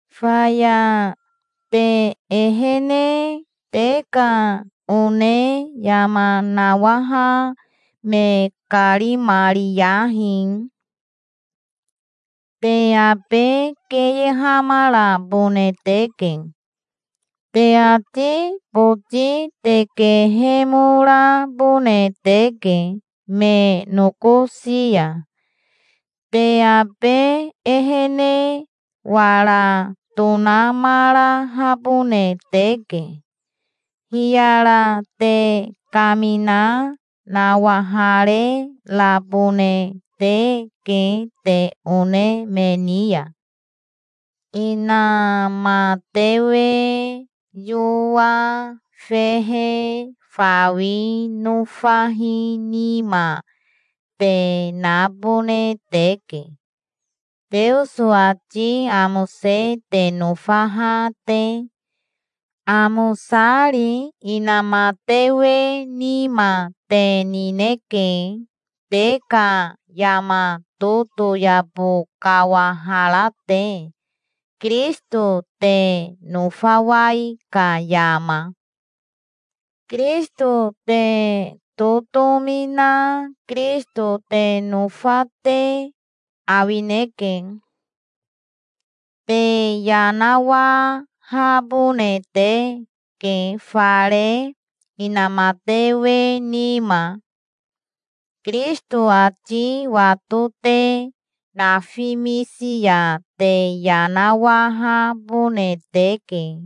Faya te ehene te ka one yama nawaha me karimariyahi. Te abe keyehamarabone teke. Te ati boti te kehemorabone teke me nokosi ya. Te abe ehene wara tonamarahabone teke. Hiyara te kamina nawahare rabone teke te one me ni ya. Inamatewe yoa fehe fawi nofahi nima te nabone teke, Teoso ati amose te nofaha te, amosari. Inamatewe nima te nineke, te ka yama totoyabo kawahara te, Kirisito te nofawai ka yama. Kirisito te totomi na Kirisito te nofa te awineke. Te yanawahabone teke fare inamatewe nima. Kirisito ati wato te nafimisi ya te yanawahabone teke.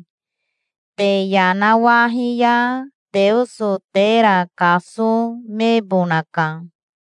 Te yanawahi ya Teoso tera kasomebonaka.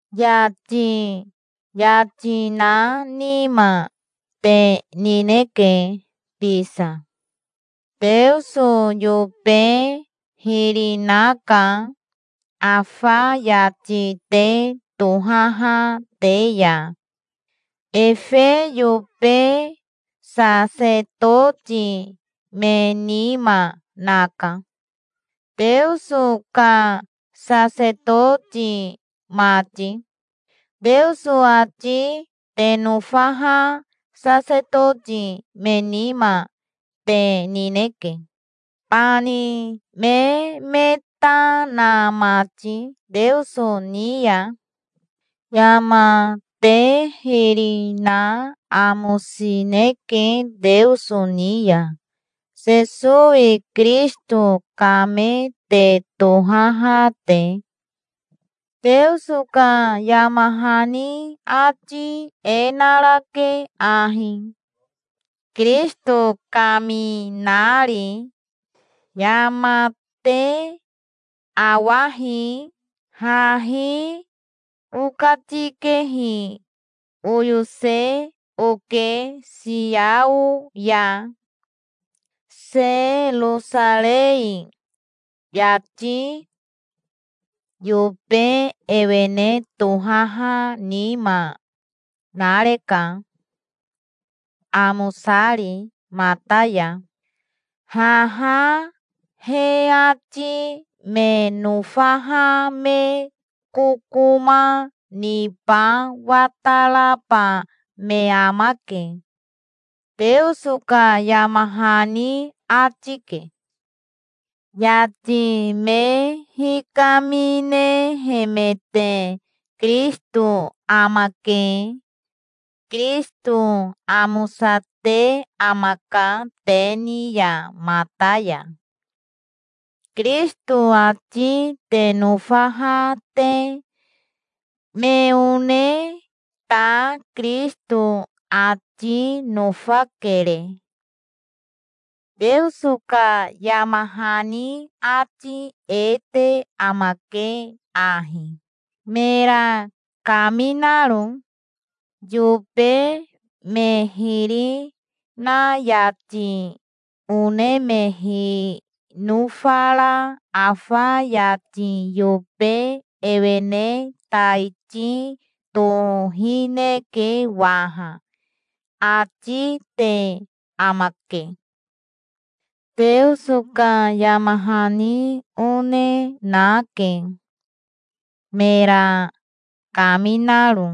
Yati yati na nima te nineke bisa. Teoso yobe hiri naka afa yati te tohaha te ya. Efe yobe sasetoti me nima naka, Teoso ka sasetoti mati. Teoso ati te nofaha sasetoti me nima te nineke, bani me me ta na mati Teoso ni ya. Yama te hiri na amosineke Teoso ni ya, Sesowi Kirisito ka me te tohaha te. Teoso ka yama hani ati e narake ahi, Kirisito kaminari: "Yama te awahi. Hahi okatikehi oyose oke Siao ya, Serosarei. Yati yobe ewene tohaha nima nareka, amosari mata ya. Haha he ati me nofaha me kokoma niba wataraba me amake", Teoso ka yama hani ati ke. Yati me hikaminehemete Kirisito amake. Kirisito amosate amaka te ni ya mata ya, Kirisito ati te nofaha te. Me one ta Kirisito ati nofakere. Teoso ka yama hani ati e te amake ahi, mera kaminaro: "Yobe me hiri na yati one me hinofara afa yati yobe ewene taiti tohineke waha", ati te amake. Teoso ka yama hani one nake, mera kaminaro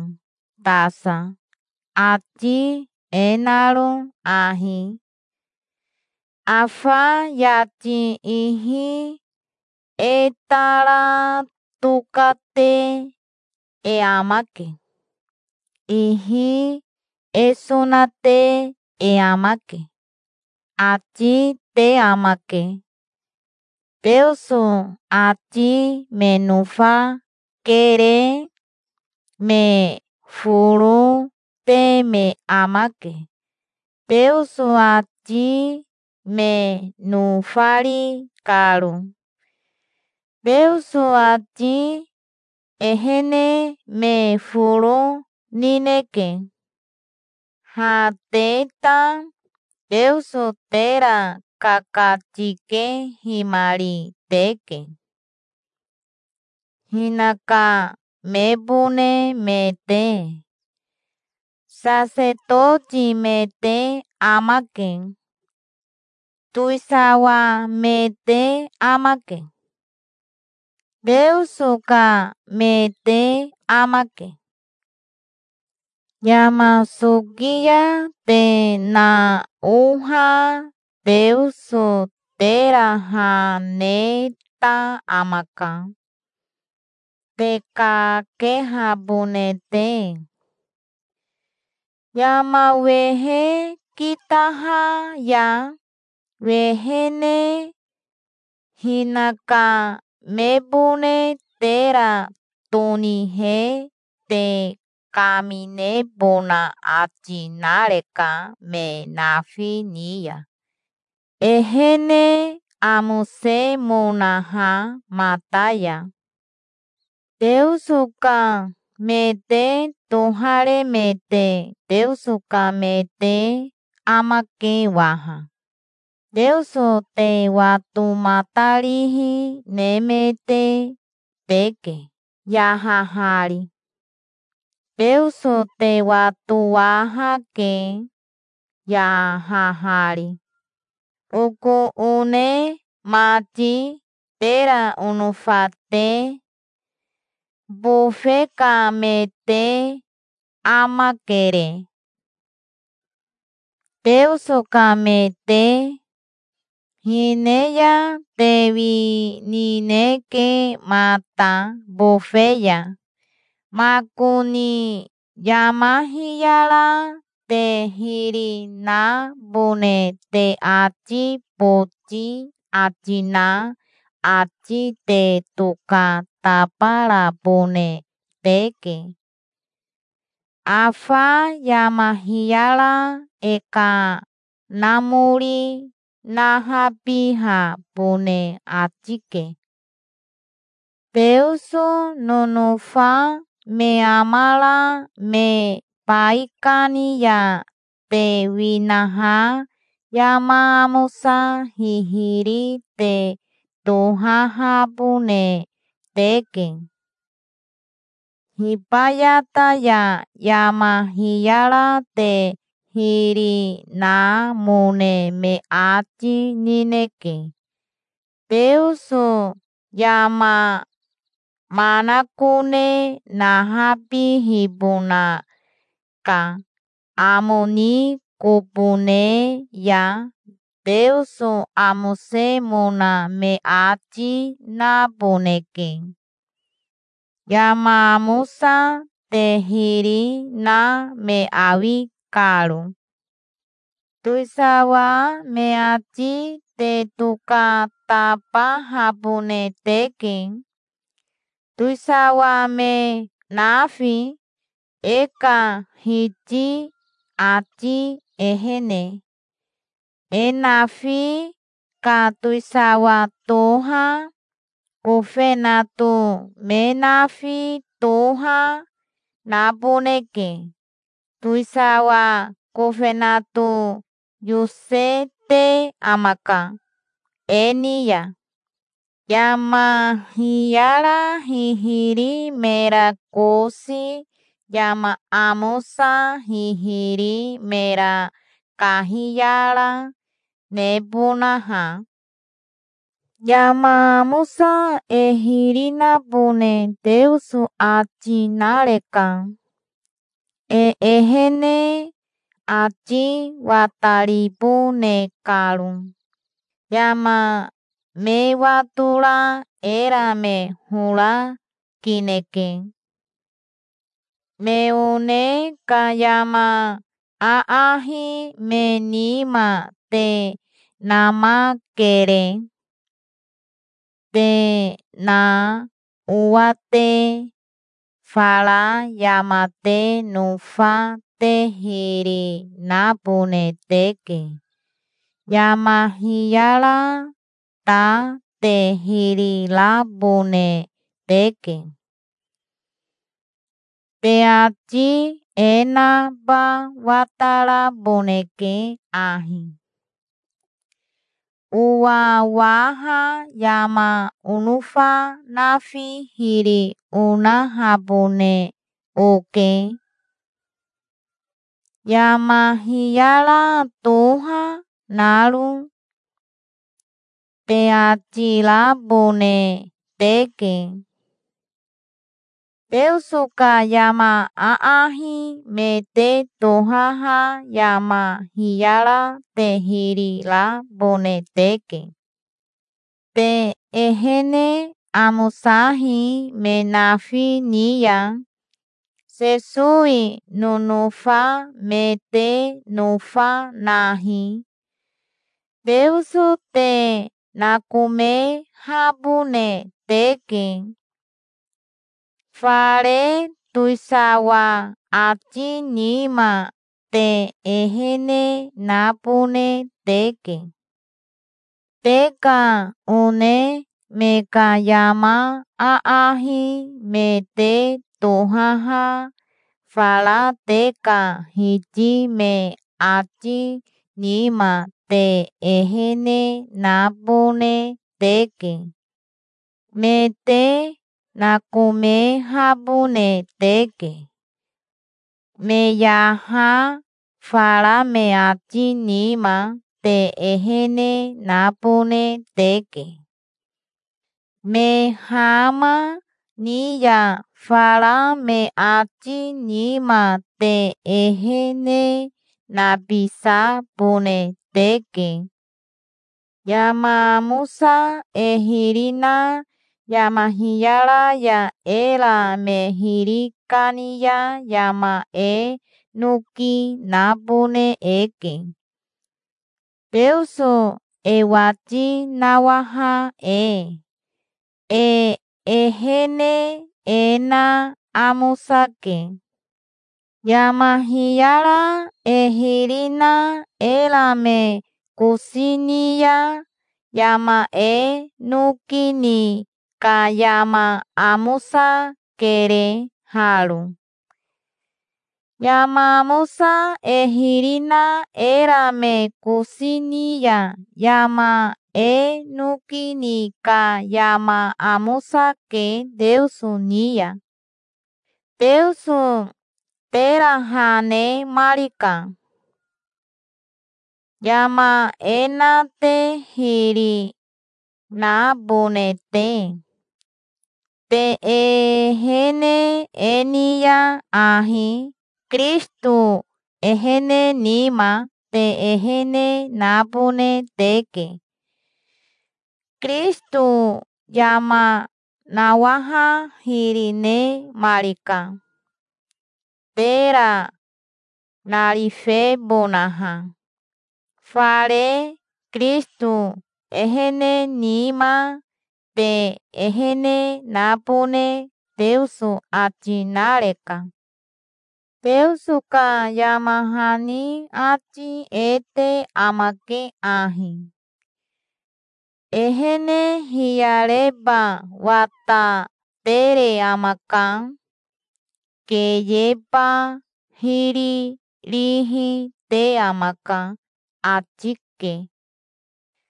tasa, ati e naro ahi: "Afa yati ihi e tara tokate e amake. Ihi e sonate e amake", ati te amake. Teoso ati me nofakere. Me foro te me amake, Teoso ati me nofari karo. Teoso ati ehene me foro nineke. Ha te ta Teoso tera kakatikehimari teke, hinaka mebone me te. Sasetoti me te amake. Towisawa me te amake. Teoso ka me te amake. Yama soki ya te naoha Teoso tera ha neta amaka, te kakehabone te, yama wehe kitaha ya, wehene. Hinaka mebone tera tonihe te kaminebona ati nareka me nafi ni ya, ehene amosemonaha mata ya. Teoso ka me te toharemete Teoso ka me te amake waha. Teoso te watomatarihi nemete teke, yahahari. Teoso te watowahake, yahahari. Oko one mati, tera onofa te, bofe ka me te amakere, Teoso ka me te. Hine ya te winineke mata bofe ya. Makoni yama hiyara te hiri nabone te ati boti ati na ati te tokatabarabone teke. Afa yama hiyara e kanamori nahabihabone ati ke. Teoso nonofa me amara me baikani ya te winaha yama amosa hihiri te tohahabone teke. Hibayata ya yama hiyara te hiri namone me ati nineke. Teoso yama manakone nahabihibona ka amo ni kobo ne ya Teoso amosemona me ati naboneke, yama amosa te hiri na me awi karo. Towisawa me ati te tokatabahabone teke, towisawa me nafi, e ka Hiti ati ehene. E nafi ka towisawa toha, kofenato me nafi toha, naboneke. Towisawa kofenato yosete amaka e ni ya, yama hiyara hihiri mera kosi, yama amosa hihiri mera kahiyara, nebonaha. Yama amosa e hiri nabone Teoso ati nareka, e ehene ati wataribone karo. Yama me watora era me hora kineke. Me one ka yama aahi me nima te namakere, te naowa te. Fara yama te nofa te hiri nabone teke. Yama hiyara ta te hiri rabone teke. Te ati e naba wataraboneke ahi, Owawaha yama onofa nafi hiri onahabone oke, yama hiyara toha naro, te ati rabone teke. Teoso ka yama aahi me te tohaha yama hiyara te hiri rabone teke. Te ehene amosahi me nafi ni ya. Sesowi nonofa me te nofa nahi. Teoso te nakomehabone teke. Fare towisawa ati nima te ehene nabone teke. Te ka one me ka yama aahi me te tohaha fara te ka hiti me ati nima te ehene nabone teke. Me te nakomehabone teke. Me yaha fara me ati nima te ehene nabone teke. Me hama ni ya fara me ati nima te ehene nabisabone teke. Yama amosa e hiri na yama hiyara ya era me hiri kani ya yama e noki nabone eke, Teoso e wati nawaha e. E ehene e na amosake. Yama hiyara e hiri na era me kosi ni ya yama e noki ni ka yama amosakere haro. Yama amosa e hiri na era me kosi ni ya yama e noki ni ka yama amosake Teoso ni ya. Teoso tera ha nemarika, yama e na te hiri nabone te. Te ehene e ni ya ahi Kirisito ehene nima te ehene nabone teke. Kirisito yama nawaha hiri nemarika, tera narifebonaha. Fare Kirisito ehene nima te ehene nabone Teoso ati nareka. Teoso ka yama hani ati e te amake ahi: "Ehene hiyareba watatere amaka. Keyeba hiri rihi te amaka", ati ke.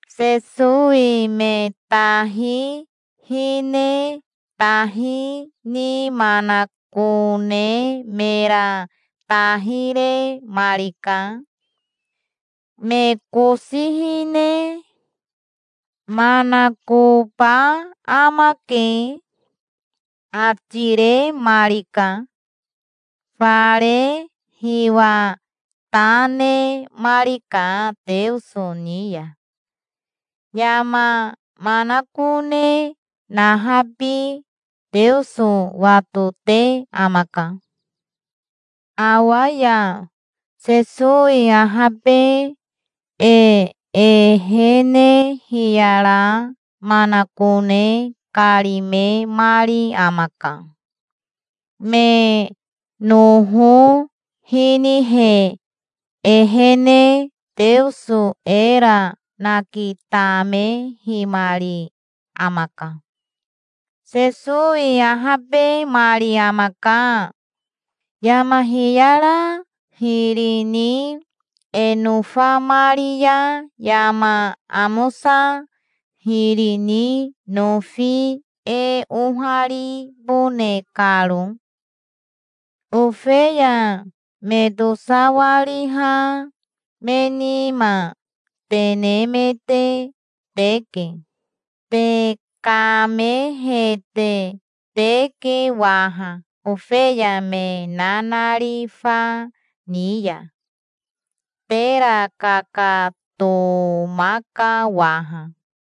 Sesowi me tahi hine tahi ni manakone mera tahi remarika. Me kosi hine "Manakoba amake", ati remarika. Fare hiwa ta nemarika Teoso ni ya. Yama manakone nahabi Teoso watote amaka. Awa ya Sesowi ahabe e ehene hiyara manakone karimemari amaka. Me noho hinihe ehene Teoso era nakitamehimari amaka. Sesowi ahabemari amaka, yama hiyara hiri ni e nofamari ya yama amosa hiri ni nofi e oharibone karo. Ofeya me tosawariha me nima te nemete teke. Te kamehete teke waha ofeya me nanarifa ni ya. Tera kakatomaka waha.